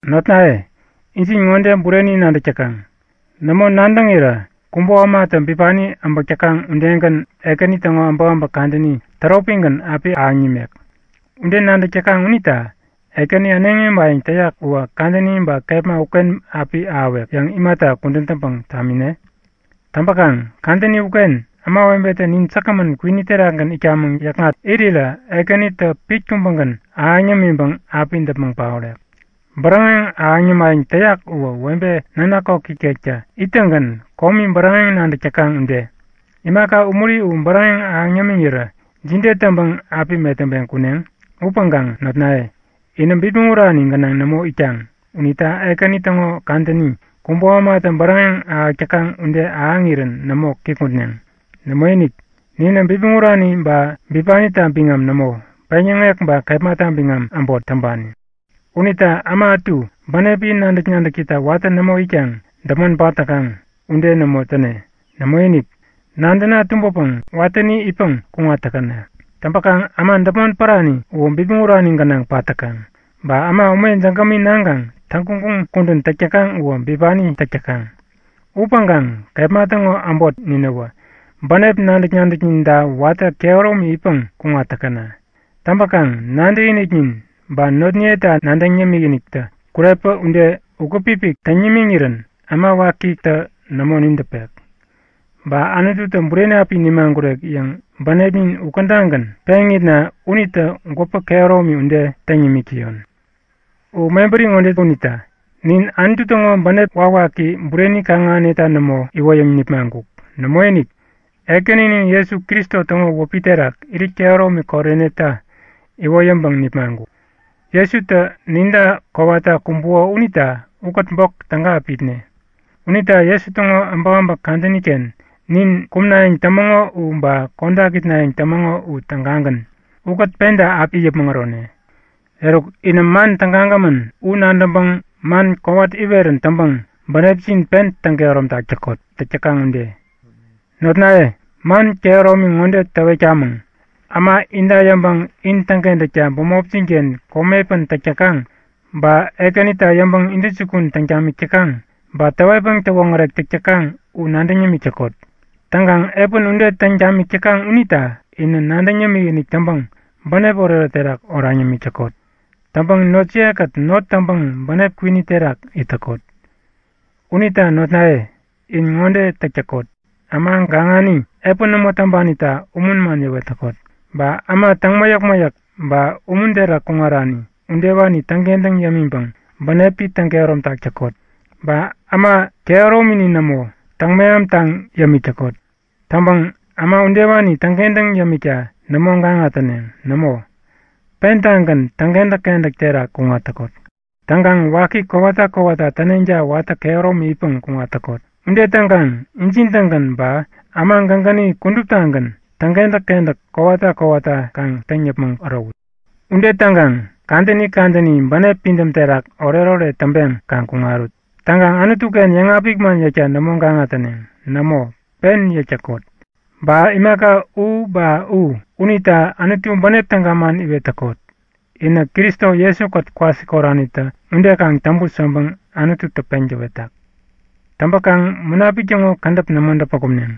Notnaye, injin ŋode bureni nadäk täkaŋ; Nämo nadäŋirä kubo ämatä bipani äbäk täkaŋ udegän Ekäni täŋo äbäkäbäk kadäni täropigän api ahäŋ nimek. Ude nadäk täkaŋ unita Ekäni äneŋi äbayäŋ täyak uwä kadäni ba kepma uken api ahäwek yäŋ imata kudän täŋpäŋ tamine? Täŋpäkaŋ kadäni uken ämawebetä nin säkgämän kwini terakgän itkamäŋ yäkŋat irirä Ekänitä pit kubägän ahäŋ yämiŋpäŋ api däpmäŋ paorek. Bäräŋeŋ ahäŋ yämayäŋ täyak uwä webe nanak koki ikektä ittäŋgän komi bäräŋeŋ nadäk täkaŋ ude. Imaka umuri u bäräŋeŋ ahäŋ yämiŋirä jide täŋpäŋ api metäŋpeŋ kuneŋ? Upäŋkaŋ notnaye, inä bipmäŋ urani gänaŋ nämo itkaŋ unita Ekäni täŋo kadäni, kubo ämatä bäräŋeŋ ahäk täkaŋ ude ahäŋirän nämo kikŋutneŋ. Nämoinik, ninä bipmäŋ urani ba bipanita biŋam nämo, peŋyäŋek ba kepmata biŋam äbot täŋpani. Unita äma ätu bänepi nadäk-nadäkita watä nämo itkaŋ däpmon pat täkaŋ ude nämo täne. Nämoinik, nadäna tumbäpäŋ watäni itpäŋ kuŋat täkäna! Täŋpäkaŋ äma däpmon pärani uwä bipmäŋ urani gänaŋ pat täkaŋ. Ba äma ume jägämi naŋkaŋ täŋguŋguŋ kudän täk täkaŋ uwä bipani täk täkaŋ. Upäŋkaŋ kepma täŋo äbot ninäwä bänep nadäk-nadäkninta watä kehäromi itpäŋ kuŋat täkäna. Täŋpäkaŋ nadäkiniknin ba notniyeta nadäŋ yämik-iniktä kurepä ude ukät-pipik täŋ nimiŋirän äma wakitä nämo nidäpek. Ba Anututä bureni api nimagurek yäŋ bänepnin ukädagän peŋitna unitä gwäpä kehäromi ude täŋ nimik täyon. U mebäri ŋode unita; Nin Anutu täŋo bänep wakwaki bureni kaŋ-ahäneta nämo iwoyäŋ nipmaŋkuk. Nämoinik! Ekäninin Jesu Kristo täŋo wäpi terak irit kehäromi koreneta iwoyäŋpäŋ nipmaŋkuk. Jesutä ninta kowata kumbuko unita ukät bok täga api itne. Unita Jesu täŋo äbäkäbäk kadäni-ken nin kumnayäŋ tämäŋo u ba kodak itnayäŋ tämäŋo u tägagän, ukät penta api it yäpmäŋ ärone. Eruk, inä man tägagämän u nadäŋpäŋ man kowat iwerän täŋpäŋ bänepjin pen täŋ-kehäromtak täkot, täk täkaŋ ude. Notnaye, man kehäromi ŋode täwetkamäŋ; Äma inta yäŋpäŋ in täŋkentäkta bämopjin-ken komi epän täk täkaŋ ba Ekänita yäŋpäŋ intäjukun täŋ tamik täkaŋ, ba täwetpäŋ täwoŋärek täk täkaŋ u nadäŋ yämik täkot. Täŋkaŋ epän ude täŋ tamik täkaŋ unita inä nadäŋ yämikinik täŋpäŋ bänep oretoret terak oraŋ yämik täkot. Täŋpäŋ notjiye-kät not täŋpäŋ bänep kwini terak it täkot. Unita notnaye, in ŋode täk täkot; Äma gaŋani, epän nämo täŋpanita umun man yäwet täkot. Ba äma täŋ mäyäk-mäyäk ba umun terak kuŋarani udewani täŋkentäŋ yämiŋpäŋ bänepi täŋ-kehäromtak täkot. Ba äma kehäromini nämo täŋ-mehamtaŋ yämik täkot. Täŋpäŋ äma udewani täŋkentäŋ yämikta nämo gaŋa täneŋ. Nämo, pentagän täŋkentäk-kentäk terak kuŋat täkot. Täŋkaŋ waki kowata kowata täneŋta watä kehäromi itpäŋ kuŋat täkot. Ude täŋkaŋ injin-tägän ba äma gägäni kuduptagän täŋkentäk-kentäk kowata kowata kaŋ täŋ yäpmäŋ ärowut. Ude täŋkaŋ kadäni kadäni bänep pidäm terak oretoret täŋpeŋ kaŋ kuŋarut. Täŋkaŋ Anutu-ken yäŋapik man yäkta nämo gaŋa täneŋ. Nämo, pen yäk täkot. Ba imaka u ba u unita Anutu bänep täga man iwet täkot. Inä Kristo Jesu-kät kwasikoranitä ude kaŋ täŋput yäŋpäŋ Anututä peŋ täwetak. Täŋpäkaŋ Munapik täŋo kädäp nämo däpä kumneŋ.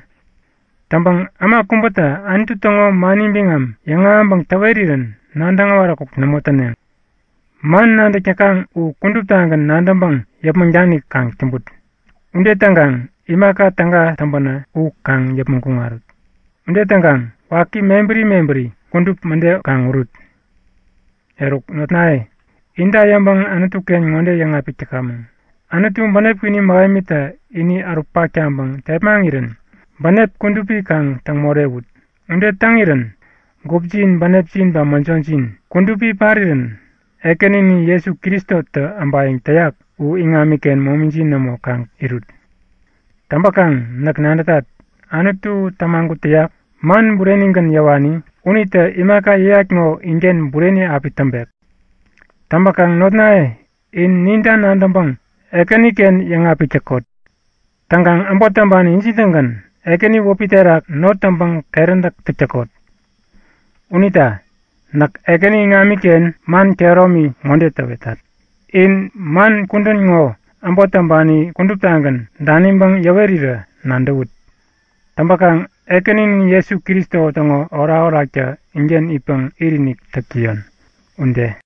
Täŋpäŋ äma kubätä Anutu täŋo mani biŋam yäŋahäŋpäŋ täwerirän nadäŋ äwaräkuk nämo täneŋ. Upäŋkaŋ man nadäk täkaŋ u kuduptagän nadäŋpäŋ yäpmäŋ danik kaŋ täŋput. Ude täŋkaŋ imaka täga täŋpänä u kaŋ yäpmäŋ kuŋarut. Ude täŋkaŋ waki mebäri mebäri kudup mäde kaŋ urut. Eruk notnaye, inta yäŋpäŋ Anutu-ken ŋode yäŋapik täkamäŋ; Anutu, bänep kwini mähemitä ini ärutpak taŋpäŋ tepmaŋirän bänep kudupi kaŋ täŋ morewut. Ude täŋirän gupjin, bänepjin ba mäjojin kudupi parirän Ekäninin Jesu Kristo äbayäŋ täyak u iŋamiken momijin nämo, kaŋ irut. Täŋpäkaŋ näk nadätat, Anutu tämagut täyak, man burenigän yäwani unitä imaka yäyat ŋo inken bureni api täŋpek. Täŋpäkaŋ notnaye, in ninta nadäŋpäŋ Ekäniken yäŋapik täkot. Täŋkaŋ äbot täŋpani injin-tägän, Ekäni wäpi terak not täŋpäŋ keräntäk täk täkot. Unita näk Ekäni iŋamiken man kehäromi ŋode täwetat; In man kudän ŋo äbot täŋpani kuduptagän daniŋpäŋ yäwerirä nadäwut. Täŋpäkaŋ Ekäninin Jesu Kristo täŋo orakoraktä inken itpäŋ itinik täk täyon. Ude.